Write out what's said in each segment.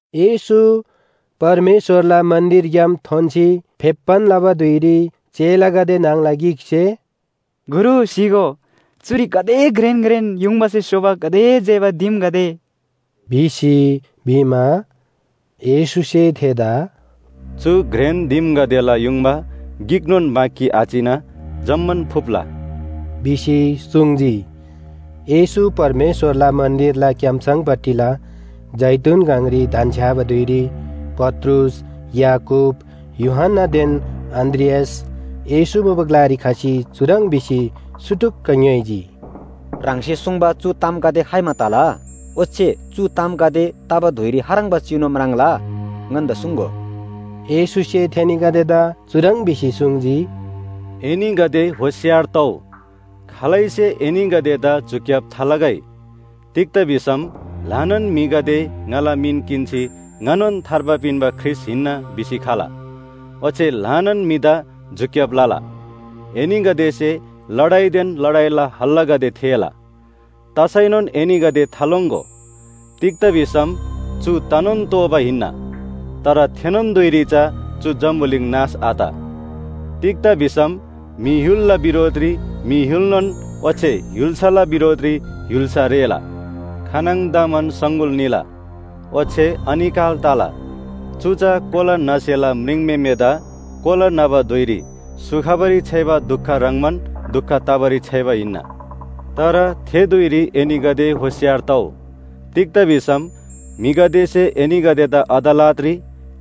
येशू परमेश्‍वरला मन्‍दिरग्‍याम थोन्‍सी फेप्‍बान लबा धुइरी चेलागदे न्‍हङला गिकसे “गुरु स्‍हीगो, चुरी गाते घ्रेन घ्रेन युङबासे स्‍होबा गाते जेबा दिमगदे” भिसी भिमा, येशूसे थेदा “चु घ्रेन दिमगदेला युङबा गिकनोन बाँकी आचिना जम्‍मान फुप्‍ला” भिसी सुङ्जी। येशू परमेश्‍वरला मन्‍दिरला क्‍याम्‍सङपट्टिला जैतून गङरी धन्‍छ्‌याबा धुइरी पत्रुस, याकूब, यूहन्‍नादेन अन्‍द्रियास येशू मुबा ग्‍लारी खसी चुह्रङ् भिसी सुटुक्‍क ङ्‌योइजी, “ह्राङसे सुङ्बा चु तामगदे खाइमा तला? ओच्‍छे चु तामगदे तबा धुइरी खाह्रङ्बा चिनु म्राङ्ला? ङन्‍दा सुङ्‍गो।” येशूसे थेनीगदेदा चुह्रङ् भिसी सुङ्जी, “एनीगदे होशियार तउ। खालैसे एनीगदेदा झुक्‍याब थालगै। तिग्‍दा भिसम ल्‍हानान म्‍हिगदे ङाला मिन किन्‍सी ‘ङानोन थार्बा पिन्‍बा ख्रीष्‍ट हिन्‍ना’ भिसी खला। ओच्‍छे ल्‍हानान म्‍हिदा झुक्‍याब लला। एनीगदेसे लडाइदेन लडाइला हल्‍लागदे थेःला। तसैनोन एनीगदे थालोङ्‍गो, तिग्‍दा भिसम चु तनोन तोःबा हिन्‍ना। तर थेनोन धुइरी चा चु जम्‍बुलिङ नाश आत। तिग्‍दा भिसम म्‍हि य्‍हुलला बिरोधरी म्‍हि य्‍हुलनोन ओच्‍छे य्‍हुल्‍साला बिरोधरी य्‍हुल्‍सा रेःला। खानङदमान सङगुल निला ओच्‍छे अनिकाल तला। चु चा कोला न्‍हसेला म्रिङम्‍हेमेदा कोला न्‍हबा धुइरी स्‍हु खबारी छ्‌याइबा दुख ह्रङ्‌बान दुख तबारी छ्‌याइबा हिन्‍ना। “तर थे धुइरी एनीगदे होशियार तउ। तिग्‍दा भिसम म्‍हिगदेसे एनीगदेदा अदालतरी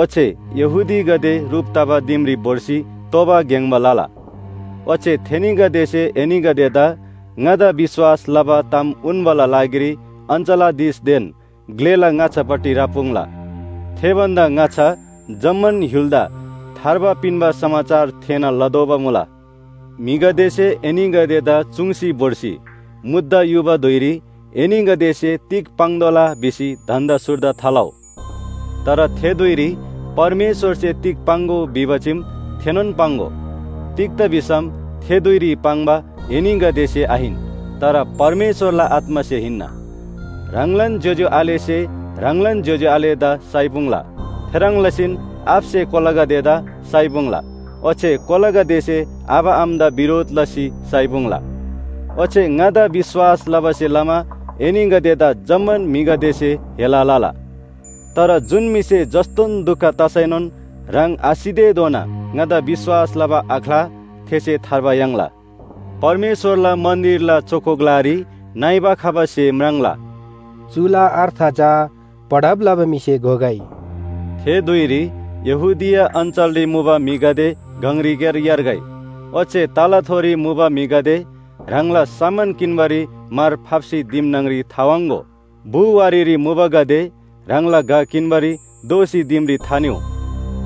ओच्‍छे यहूदीगदे ह्रुप तबा दिमरी भोर्सी तोबा ग्‍याङ्‍बा लला। ओच्‍छे थेनीगदेसे एनीगदेदा ङादा विश्‍वास लबा ताम उन्‍बाला लागिरी अञ्‍चलाधीशदेन ग्‍लेला ङाच्‍छापट्टि राप्‍पुङ्ला। थे भन्‍दा ङाच्‍छा जम्‍मान य्‍हुलदा थार्बा पिन्‍बा समाचार थेःना लतोःबा मुला। म्‍हिगदेसे एनीगदेदा चुङ्सी भोर्सी मुद्दा युबा धुइरी एनीगदेसे तिग पाङ्तोःला भिसी धन्‍दा सुर्दा थालउ। तर थे धुइरी परमेश्‍वरसे तिग पाङ्‍गो भिबा चीम थेनोन पाङ्‍गो। तिग्‍दा भिसम थे धुइरी पाङ्बा एनीगदेसे आहिन तर परमेश्‍वरला आत्‍मासे हिन्‍ना। “ह्राङलान ज्‍योज्‍यो आलेसे ह्राङलान ज्‍योज्‍यो आलेदा साइपुङ्ला। थेह्रङ् लसीन आबासे कोलागदेदा साइपुङ्ला ओच्‍छे कोलागदेसे आबा आमादा बिरोधरी लसी साइपुङ्ला। ओच्‍छे ङादा विश्‍वास लबासे लमा एनीगदेदा जम्‍मान म्‍हिगदेसे हेला लला। तर जुन म्‍हिसे जस्‍तोन दुख तसैनोन ह्राङ आसितेधोना ङादा विश्‍वास लबा आख्‍ला थेसे थार्बा याङ्ला। “परमेश्‍वरला मन्‍दिरला चोखो ग्‍लारी नइबा खबा स्‍हे म्राङ्ला।” चुला अर्थ चा पढब लबा म्‍हिसे घोगै। “थे धुइरी यहूदिया अञ्‍चलरी मुबा म्‍हिगदे गङरीक्‍यार यार्गै। ओच्‍छे तलाथोरी मुबा म्‍हिगदे ह्राङला सामान किन्‍बारी मार फाप्‍सी दिम न्‍हङरी थावाङ्‍गो। बु वारीरी मुबागदे ह्राङला घ किन्‍बारी दोःसी दिमरी थानिउ।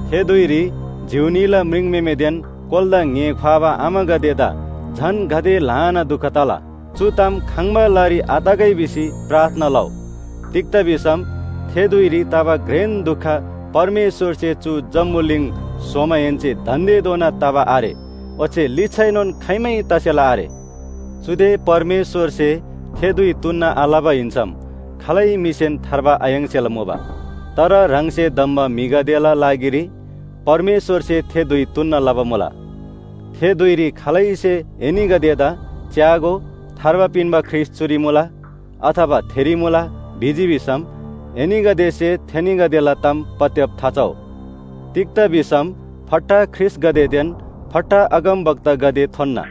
थे धुइरी जिउ न्‍हीला म्रिङम्‍हेमेदेन कोलादा ङ्‍हे ख्‍वाबा आमागदेदा झन गाते ल्‍हानान दुख तला! चु ताम खङ्‍बा लारी आतगै भिसी प्रार्थना लउ। तिग्‍दा भिसम थे धुइरी तबा घ्रेन दुख परमेश्‍वरसे चु जम्‍बुलिङ स्‍होमाहेन्‍से दान्‍देधोना तबा आरे ओच्‍छे लिच्‍छाएनोन खाइमै तसेला आरे। चुदे परमेश्‍वरसे थे धुइ तुन्‍ना आलबा हिन्‍सम खालै म्‍हिसेन थार्बा आयाङ्सेला मुबा। तर ह्राङसे धम्‍बा म्‍हिगदेला लागिरी परमेश्‍वरसे थे धुइ तुन्‍ना लबा मुला। “थे धुइरी खालैसे एनीगदेदा ‘च्‍यागो, थार्बा पिन्‍बा ख्रीष्‍ट चुरी मुला,’ अथवा ‘थेरी मुला,’ भिजी भिसम एनीगदेसे थेनीगदेला ताम पत्‍याब थाचउ। तिग्‍दा भिसम फट्टा ख्रीष्‍टगदेदेन फट्टा अगमवक्तागदे थोन्‍ना।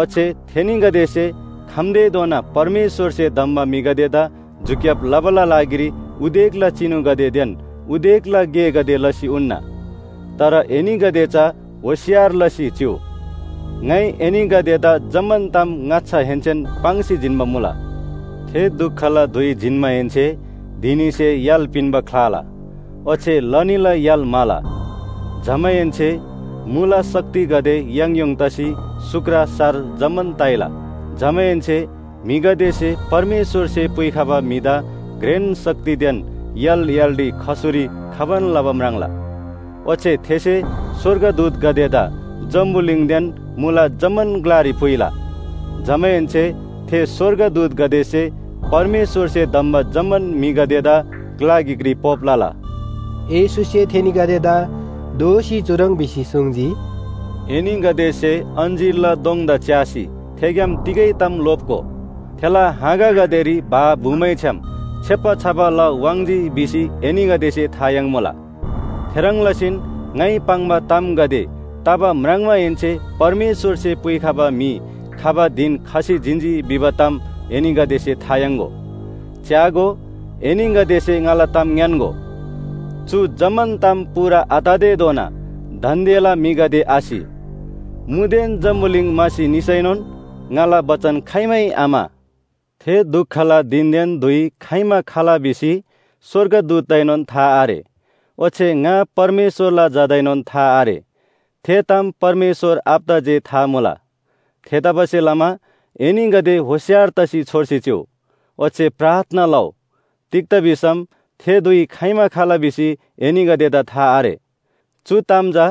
ओच्‍छे थेनीगदेसे खम्‍तेधोना परमेश्‍वरसे धम्‍बा म्‍हिगदेदा झुक्‍याब लबाला लागिरी उदेकला चिनुगदेदेन उदेकला गेगदे लसी उन्‍ना। तर एनीगदे चा होशियार लसी चिउ। ङाइ एनीगदेदा जम्‍मान ताम ङाच्‍छाहेन्‍सेन पाङ्सी पिन्‍बा मुला। “थे दुखला धुइ जिन्‍माहेन्‍से धिनीसे य्‍हाल पिन्‍बा ख्‍लाला ओच्‍छे लनीला य्‍हाल म्‍हाला। जमाहेन्‍से मुला शक्तिगदे याङयोङ तसी सुक्र सार जम्‍मान ताइला। जमाहेन्‍से म्‍हिगदेसे परमेश्‍वरसे पुइखबा म्‍हिदा घ्रेन शक्तिदेन य्‍हाल य्‍हालरी खसुरी खबान लबा म्राङ्ला। ओच्‍छे थेसे स्‍वर्गदूतगदेदा जम्‍बुलिङदेन मुला जम्‍मान ग्‍लारी पुइला। जमाहेन्‍से थे स्‍वर्गदूतगदेसे परमेश्‍वरसे धम्‍बा जम्‍मान म्‍हिगदेदा ग्‍ला गिकरी पोप लला।” येशूसे थेनीगदेदा दोःसी चुह्रङ् भिसी सुङ्जी, “एनीगदेसे अञ्‍जीरला दोङदा च्‍यासी थेग्‍याम तिगै ताम लोप्‍गो। थेला हाँगागदेरी भा भुमैछ्‌याम छेप्‍बा छबा ला वाङ्‌जी भिसी एनीगदेसे था याङ्मुला। थेह्रङ् लसीन ङाइ पाङ्बा तामगदे तबा म्राङ्माहेन्‍से परमेश्‍वरसे पुइखबा म्‍हि खबा धिन खसी जिन्‍जी भिबा ताम एनीगदेसे था याङ्‍गो। च्‍यागो, एनीगदेसे ङाला ताम ङ्‌यान्‍गो, चु जम्‍मान ताम पूरा आततेधोना दान्‍देला म्‍हिगदे आसि। मुदेन जम्‍बुलिङ म्‍हासी निसैनोन ङाला बचन खाइमै आम्‍हा। “थे दुखला धिनदेन धुइ खाइमा खला भिसी स्‍वर्गदूतदाएनोन था आरे ओच्‍छे ङा परमेश्‍वरला झादाएनोन था आरे। थे ताम परमेश्‍वर आबादा जे था मुला। थेतबासेलमा एनीगदे होशियार तसी छोर्सी चिउ। ओच्‍छे प्रार्थना लउ, तिग्‍दा भिसम थे धुइ खाइमा खला भिसी एनीगदेदा था आरे। “चु ताम चा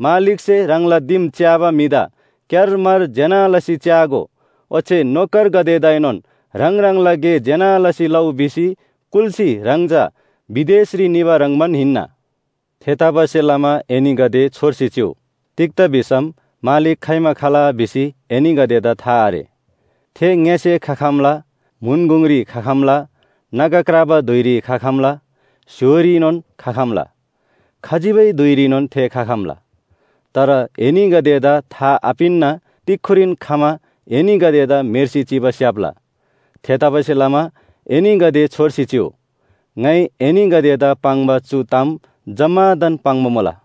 मालिकसे ह्राङला दिम च्‍याबा म्‍हिदा क्‍यारमार ज्‍यना लसी च्‍यागो, ओच्‍छे नोकरगदेदाएनोन ह्राङ ह्राङला गे ज्‍यना लसी लउ भिसी कुल्‍सी ह्राङ चा विदेशरी निबा ह्रङ्‌बान हिन्‍ना। थेतबासेलमा एनीगदे छोर्सी चिउ, तिग्‍दा भिसम मालिक खाइमा खला भिसी एनीगदेदा था आरे। थे ङ्‍यसे खखम्‍ला, म्‍हुन गुङरी खखम्‍ला, नागा क्राबा धुइरी खखम्‍ला, स्‍य्‍होरीनोन खखम्‍ला खजिबै धुइरीनोन थे खखम्‍ला। तर एनीगदेदा था आपिन्‍ना तिक्‍खुरीन खमा एनीगदेदा म्‍हेर्सी चिबा स्‍याप्‍ला। थेतबासेलमा एनीगदे छोर्सी चिउ, ङाइ एनीगदेदा पाङ्बा चु ताम जम्‍मादान पाङ्बा मुला।”